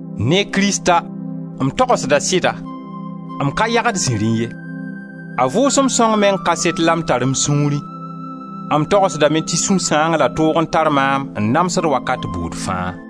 Ne Krista m togsda sɩda, m ka yagd ziri ye, — a Vʋʋsem Sõng meng kaset la m tar m sũurẽ — m togsdame tɩ sũ-sãang la toog n tar maam n namsd wakat buud fãa.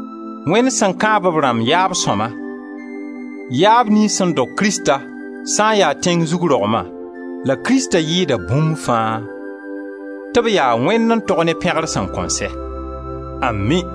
Wẽnd sẽn kãab b rãmb yaab sõma, yaab niyns sẽn dog Krista, sã n ya tẽng zug rogma, la Krista yɩɩda bũmb fãa, tɩ b yaa Wẽnd n tog ne pẽgr sẽn kõn sɛ. Ami!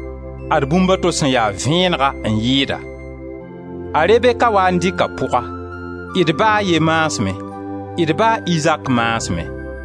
Ad bũmba to sẽn ya vẽenega n yɩɩda: a Rebeka waa n dɩka pʋga, d ba a ye maasmẽ, d ba a Izaak maasmẽ.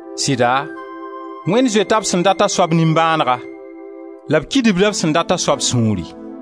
Sɩda Wẽnd zoeta b sẽn dat a soab nimbãanega la b kidibda b sẽn dat a soab sũuri.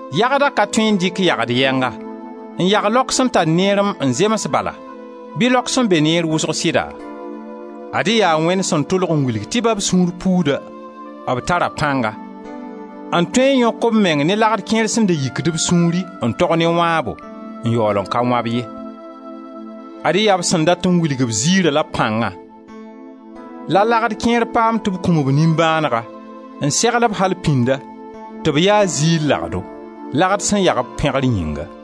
Yagda ka tõe n dɩk yagd yɛnga n yag laok sẽn tar neerem n zems bala bɩ laok sẽn be neer wʋsg sɩda? Ad-y yaa Wẽnd sẽn tʋlg n wilg tɩ ba b sũur puuda, b tara pãnga n tõe n yõk b menga ne lagd kẽer sẽn da yikd b sũuri n tog ne wãabo, n yaool n ka wã-b ye. Ad-y yaa b sẽn dat n wilg b ziira la b pãnga, la lagd kẽer paam tɩ b kũm-b nimbãanegã n segl-b al pĩnda tɩ b ya ziir lagdo, lagd sẽn yag b pẽgr yĩnga.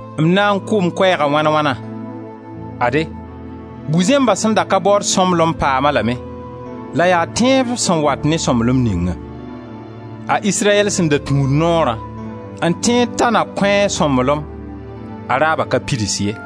M na n kʋʋ m koɛɛga wãn wãna? Ade, Bu-zẽmba sẽn da ka baood sõmblem paam-a lame la yaa tẽeb sẽn wat ne sõmblem ningã. A Israyɛl sẽn da tũud noorã n tẽed ta na kõ-a sõmblem, a raaba ka pids ye.